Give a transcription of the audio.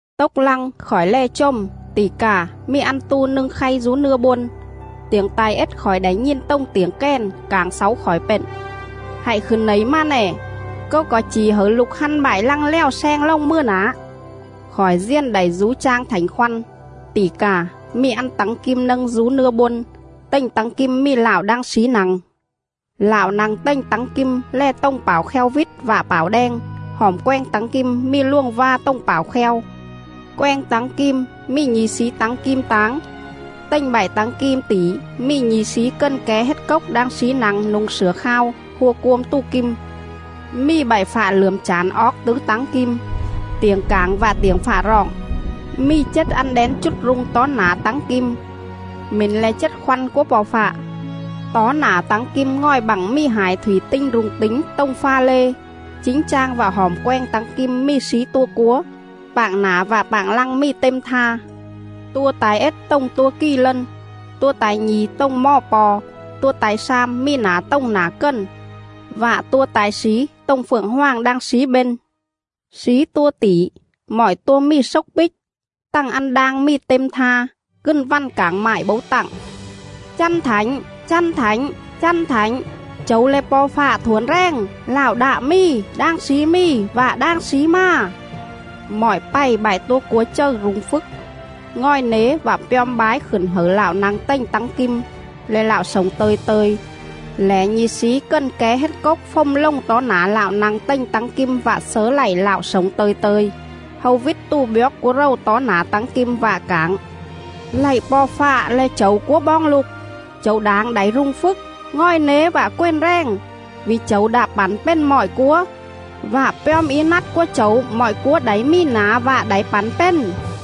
Tốc lăng, khỏi lè chồm, tỉ cà, mì ăn tu nâng khay dú nưa bôn! Tiểng ta̱i ết khỏi đảy nhìn tồng tiểng kèn, cảng xáu khỏi pện: “Hạy khửn nẩy mà nè, Câu co̱i chỉ hẩư lục hăn bại lăng lèo sleng lồng mừa nả.” Khỏi diền đảy dú chang Thảnh Khoăn; tỉ cà, mì ăn tắng kim nâng dú nưa bôn; tềnh tắng kim mì Lạo đang slí nă̱ng!. Lạo nă̱ng tềnh tắng kim lè tồng pảo kheo vít vạ pảo đeng; hỏm quenh tắng kim mì luồng va tồng pảo kheo. Quenh tắng kim mì nhi̱ slí tắng kim táng, tềnh bại tắng kim tỉ mì nhi̱ slí cần ké hết cốc đang slí nă̱ng nu̱ng slửa khao, hua cuôm tù kim. Mì bại fạ lưởm chản oóc tứ tắng kim, tiểng cảng vạ tiểng fạ roọng; mì chết ăn đén chút rung tó nả tắng kim, mỉn le̱ chết khoăn cúa Po̱ Fạ.. Tó nả tắng kim ngòi bặng mì hải thủy tinh rung tính tồng pha lê; chính chang vạ hỏm quenh tắng kim mì slí tua cúa, pạng nả vạ pạng lăng mì têm tha.. Tua ta̱i ết tồng tua kì lân, tua ta̱i nhi̱ tồng mò po̱, tua ta̱i slam mì nả tồng nả cần, vạ tua ta̱i slí tồng phượng hoàng đang slí bên. Slí tua tỉ, mọi tua mì xốc píc, tằng ăn đang mì têm tha; cừn vằn cảng mại bấu tặng:. “Chăn thảnh, chăn thảnh, chăn thảnh, Chẩu le̱ Po̱ Fạ Thuổn Rèng, LẠO ĐẠ MÌ, ĐANG SLÍ MÌ VẠ ĐANG SLÍ MÀ!” Mọi pày bại tua cúa chầư rung phjức, ngòi nế vạ pjom bái khửn hẩư Lạo nă̱ng tềnh tắng kim, le̱ Lạo slổng tơ̱i tơ̱i, lẻ nhi̱ slí cần ké hết cốc fồm lồng tó nả Lạo nă̱ng tềnh tắng kim vạ slớ lạy Lạo slổng tơ̱i tơ̱i. Hâu vít tù bjoóc cúa rầu tó nả tắng kim, vạ cảng: “Lạy Po̱ Fạ le̱ Chẩu cúa boong lục, Chẩu đảng đảy rung phjức, ngòi nế vạ quền rèng, Vỉ Chẩu đạ pẳn pền mọi cúa, Vạ pjom í nắt cúa Chẩu mọi cúa đảy mì nả vạ đảy pẳn pền.”